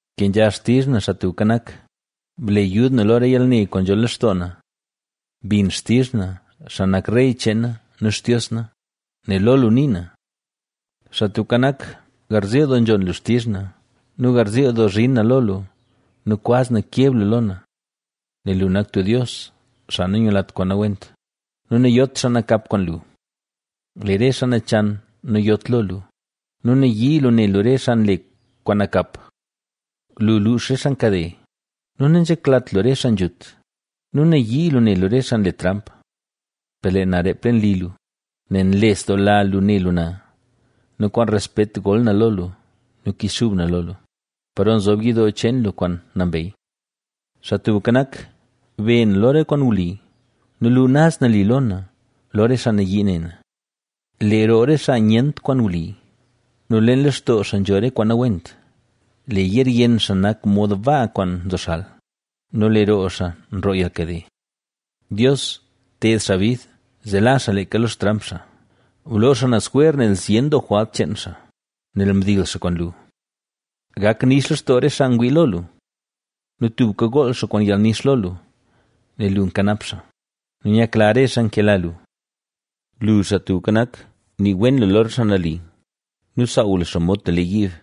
Kenzha xtizh na, Xaa Tubka Nak, ble yud na lo re yalne kwaan nzho lextoo na. Bin xtizh na, xaa nak Rey cheen na nu Xtios na, nel lo lu nii na. Xaa Tubka Nak, garziil doo nzhon lu xtizh na nu garziil doo zhin na lo lua nu kwaz na keb lu lo na. Nel lu nak tub Dios, xaa nanyulat kwaan nawent nu nayot xaa nakap kwaan lu. Lee re xaa nachan nayot lo lu nu nayii lu ne lu re xaa nle kwaan nakap. Lu luux re xaa nkade nu nanzheklat lu re xaa nzhut nu nayii lu ne lu re xaa nle tramp. Per lee na reep leen li lu, nel nlesdoola lu ne lu na nu kwaan respet gol na lo lu nu kichxub na lo lu, paro nzob yidoo cheen lu kwaan nambey. Xaa Tubka Nak, be na lo re kwaan wli nu lu naz nali lo na, lo re xaa nayii ne na. Lee roo re xaa nyent kwaan wli nu leen lextoo xaa nzho re kwaan nawent, lee yeer yenn xaa nak mod baa kwaan nzoxal nu lee roo xaa nroo yalnkade. ¡Dios, ted xaa bid! ¡Zee la xaa leeka lo xtramp xaa! Bloo xaa naz jwer nel zyen doo jwalt cheen xaa, nel mdil xaa kwaan lu. Gak nix lextoo re xaa ngwii lo lu nu tubka gool xaa kwaan yalnix lo lu, nel lu nkanap xaa; nu nyakla re xaa nkela lu. Lu, Xaa Tubka Nak, nii wen lu lo re xaa nali nu saaw lu xaa mod tub lee yiib.